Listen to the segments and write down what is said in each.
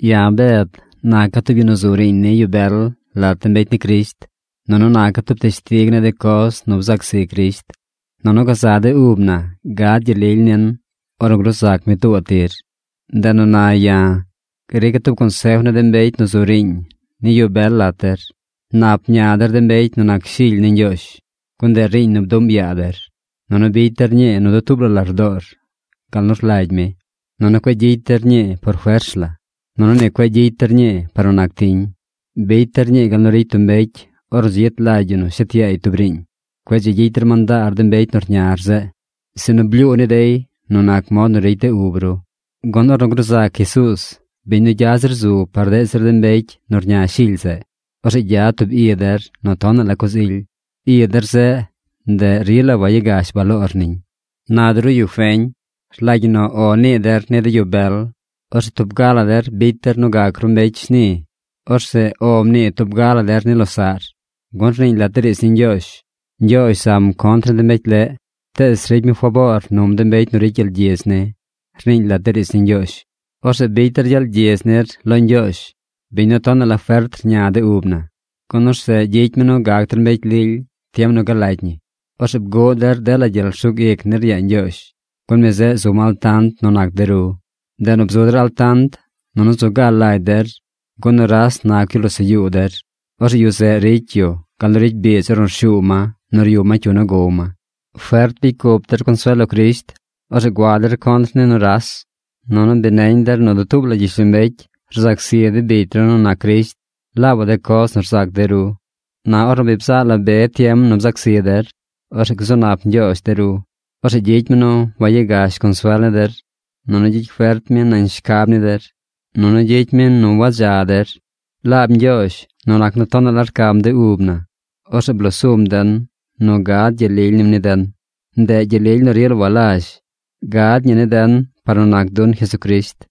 Ya̱ Bed naca̱ tub yu nu zu riiñ ni yu bel lat de mbecy ni Crisht, nunu naca̱ tub teshtig ni de coz nu bzac zi Crisht, nunu gazaꞌ de ub na gad gyel lily nin ornu gruu zac mi tuubaꞌ tir. Ndeꞌ nu na ya̱ grica̱ tub consef ni de mbecy nu zu riiñ ni yu bel lat der. Nap mña der de mbecy nu nac shily ni Ñgyoozh, gun ndeꞌ riiñ nu bduꞌm yaa der. Nunu bicy der ñii nu dutuub la lardoor gal nu rlagy mi. Nunu cueꞌ gyicy der ñii por fers la. Nunu ni cueꞌ gyicy der ñii par nu nac tiñ. Bicy der ñii gal nu ricy tub mbecy ornu dzi yet lagy yu nu shet yaay tub riiñ. Cueꞌ dzi gyicy der mandaar de mbecy nu rñar zeꞌ, sinu blyuu ni dey nu nac mod nu ricy de ub ru. Gun ornu gruu zac Jesuuz, biñ nu gya zir zu par deꞌ zir de mbecy nu rña shily zeꞌ, orzeꞌ gyad tub i der nu tonaꞌ la coz ily. I der zeꞌ, ndeꞌ rila wayagash baloor niñ. Na de ru yu feñ, rlagy ñi nu “O” nii der ni de yu bel. Orzeꞌ tub ga la der bicy der nu gac ru mbecy shni. Orzeꞌ “O” mnii tub ga la der ni losaꞌr. Gun rniiñ lat de riidz ni Ñgyoozh: Ñgyoozh zam contr ni de mbecy leꞌ, tees ricy mi faboor num de mbecy nu ricy gyel gyidz ni, rniiñ lat de riidz ni Ñgyoozh. Orzeꞌ bicy der gyel gyidz nir lo Ñgyoozh, biñ nu tonaꞌ la fert rña de ub na, gun orzeꞌ gyicy mi nu gac der mbecy lily tiem nu galagy ñi. Orzeꞌ bguꞌ der dela gyel rsug ic nir yaa Ñgyoozh, gun mi zeꞌ zum altant nu nac de ru. Ndeꞌ nu bzu der altant nunu zu ga lagy der, gun nuras nac yu losaꞌ yuu der. Orzeꞌ yu zeꞌ ricy yu gal nu ricy biidz ornu rshuu ma nu ryub ma cyu nu gow ma. Fert bicy cup der consuel lo Crisht. Orzeꞌ gua der contr ni nuras. Nunu bi neñ der nu dutuub la gyishlombecy rzac zi de bicy ru nu nac Crisht laabaꞌ de coz nu rzac de ru. Na ornu bi bzaꞌ la be tiem nu bzac zi der, orzeꞌ gzu nap Ñgyoozh de ru. Orzeꞌ gyicy mi nu wayagash consuel ni der. Nunu gyicy fert mi nañ shacab ni der. Nunu gyicy mi nu wadza der. Laab Ñgyoozh, nu nac nu tonaꞌ la rcam de ub na, orzeꞌ blosum den nu gad gyel lily nim ni den. Ndeꞌ gyel lily nu rila walazh. Gad ñi ni den par nu nac dun Jesucrisht.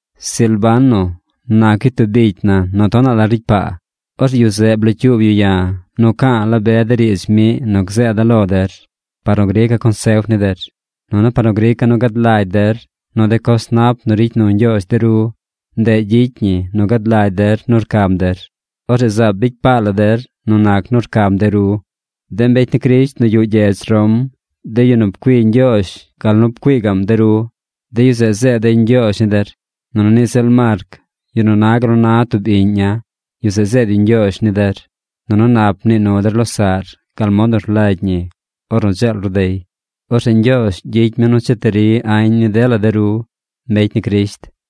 Silvano nac yu tub bicy na nu tonaꞌ la ricy paa. Orzeꞌ yu zeꞌ blocyuub yu ya̱ nu ca̱a̱ la be de riidz miꞌ nu gzeeda̱ lo der par nu grica̱ consef ni der, nunu par nu grica̱ nu gad lagy der nu de coz nap nu ricy nu Ñgyoozh de ru, ndeꞌ gyicy ñi nu gad lagy der nu rcam der. Orzeꞌ zaab bicy paa la der nu nac nu rcam de ru. De mbecy ni Crisht nu yuꞌ gyedz Rom, de yu nu pcui Ñgyoozh gal nu pcui gaꞌm de ru, de yu zeꞌ zeed dey ñgyoozh ni der. Nunu niꞌ ziꞌl Marc, yu nu na gal nu na tub iꞌña̱, yu zeꞌ zeed yu ñgyoozh ni der. Nunu nap mnii nu der losaꞌr gal mod nu rlagy ñi ornu dzeel ru dey. Orzeꞌ Ñgyoozh gyicy mi nu cheti ri añ ni dela de ru mbecy ni Crisht.